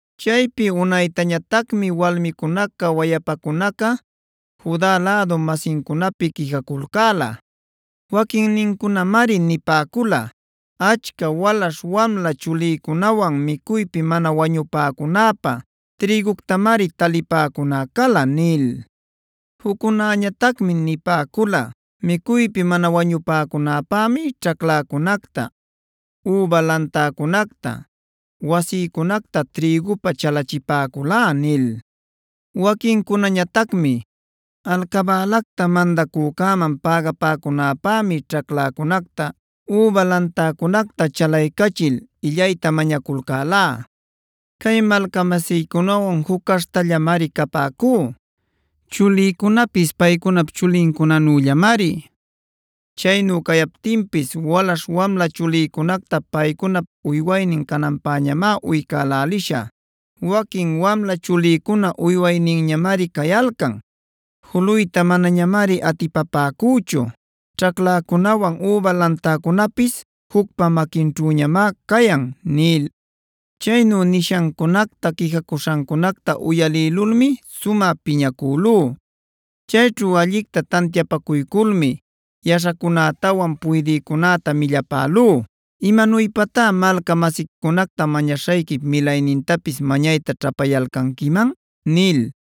Chaypi unaytañatacmi walmicunaca wayapacunaca Juda lädu-masincunapi quijaculcäla. Waquinnincunamari nipäcula: “Achca walaśh-wamla chulïcunawan micuypi mana wañupäcunäpä trïguctamari talipäcuná cala” nil. Juccunañatacmi nipäcula: “Micuypi mana wañupäcunäpämi ćhacläcunacta, üba lantäcunacta, wasïcunacta trïgupä chalachipäculá” nil. Waquincunañatacmi: “Alcabälacta mandacücäman pägapäcunapämi ćhacläcunacta, üba lantäcunacta chalaycachil illayta mañaculcälá. Cay malcamasïcunawan juc caśhtallamari capäcú. Chulïcunapis paycunap chulincunanüllamari. Chaynu cayaptinpis walaśh-wamla chulïcunacta paycunap uywaynin cananpäñamá uycäläliśhä. Waquin wamla chulïcuná uywayninñamari cayalcan; juluytá manañamari atipapäcüchu. Ćhacläcunawan üba lantäcunapis jucpa maquinćhüñamá cayan” nil. Chaynu nishancunacta quijacuśhancunacta uyalïlulmi sumä piñacülú. Chayćhu allicta tantiapacuyculmi yaśhacunätawan puydïcunäta millapälú: “¿Imanuypatá malca-masiquicunacta mañaśhayquip milaynintapis mañayta ćhapayalcanquiman?” nil.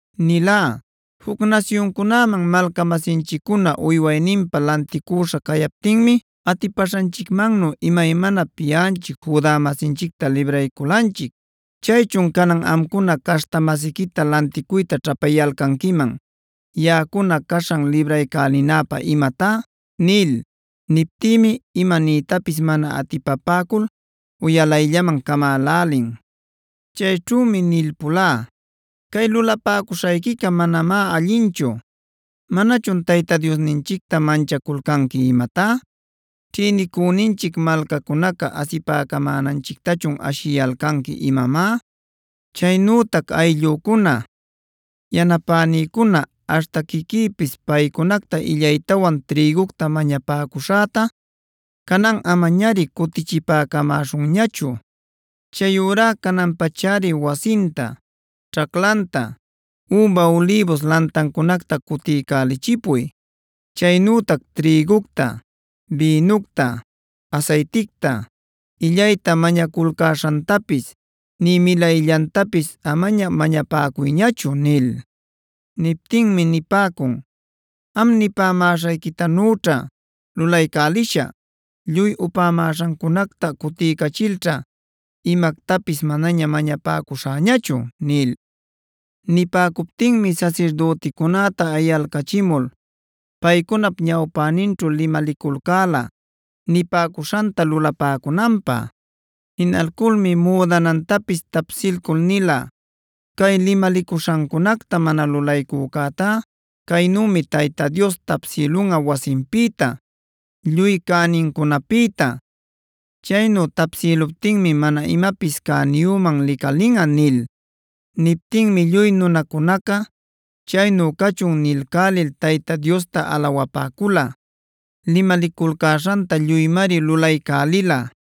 nilá: “Juc nasyuncunaman malca-masinchiccuna uywayninpä lanticüśha cayaptinmi atipäśhanchicmannu imaymanap yaꞌanchic Juda-masinchicta librayculanchic. ¿¡Chaychun canan amcuna caśhta-masiquita lanticuyta ćhapayalcanquiman yaꞌacuna caśhan libraycälinäpä imatá!?” nil. Niptïmi ima niytapis mana atipapäcul uyalayllaman camälälin. Chayćhümi nilpulá: “Cay lulapäcuśhayquica manamá allinchu. ¿Manachun Tayta Diosninchicta manchaculcanqui imatá? ¿Ćhïnicüninchic malcacunaca asipäcamänachictachun ashiyalcanqui imamá? Chaynütac ayllücuna, yanapänïcuna aśhta quiquïpis paycunacta illaytawan trïgucta mañapäcuśhäta cananꞌa amañari cutichipäcamäśhunñachu. Chayurá canan-pachari wasinta, ćhaclanta, üba ulïbus lantancunacta cutiycälichipuy. Chaynütac trïgucta, bïnucta, asayticta, illayta mänuculcäśhantapis nï milayllantapis amaña mañapäcuyñachu” nil. Niptïmi nipäcun: “Am nipämäśhayquitanüćha lulaycälishä. Lluy upämäśhancunacta cutiycachilćha imactapis manaña mañapäcuśhäñachu” nil. Nipäcuptinmi sasirdüticunäta ayalcachimul paycunap ñawpäninćhu limaliculcäla nipäcuśhanta lulapäcunanpä. Jinalculmi müdanätapis tapsilcul nilá: “Cay limalicuśhancunacta mana lulaycücätá caynümi Tayta Dios tapsïlunꞌa wasinpïta, lluy cänincunapïta. Chaynu tapsïluptinmi mana imapis cäniyüman licalinꞌa” nil. Niptïmi lluy nunacunaca: “Chaynu cachun” nilcälil Tayta Diosta alawapäcula. Limaliculcäśhanta lluymari lulaycälila.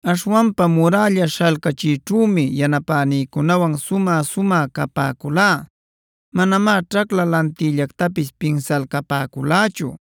Aśhwanpa murälla śhalcachiyćhümi yanapänïcunawan sumä-sumä capäculá. Manamá ćhacla lantiyllactapis pinsalcapäculächu.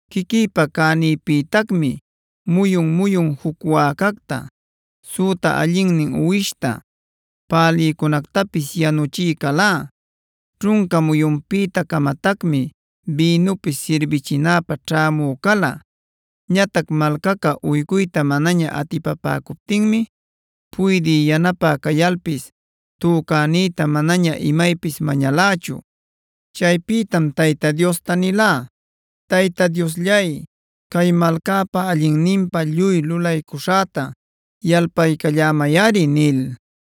Quiquïpi cänïpïtacmi muyun-muyun juc wäcacta, süta allinnin uwishta, pälïcunactapis yanuchï calá. Ćhunca muyunpïta-camatacmi bïnupis sirbichinäpä ćhämü cala. Ñatac malcaca uycuyta manaña atipapäcuptinmi puydï yanapä cayalpis tücänïta manaña imaypis mañalächu. Chaypïtam Tayta Diosta nilá: “Tayta Diosllay, cay malcäpa allinninpä lluy lulaycuśhäta yalpalcallämayꞌari” nil.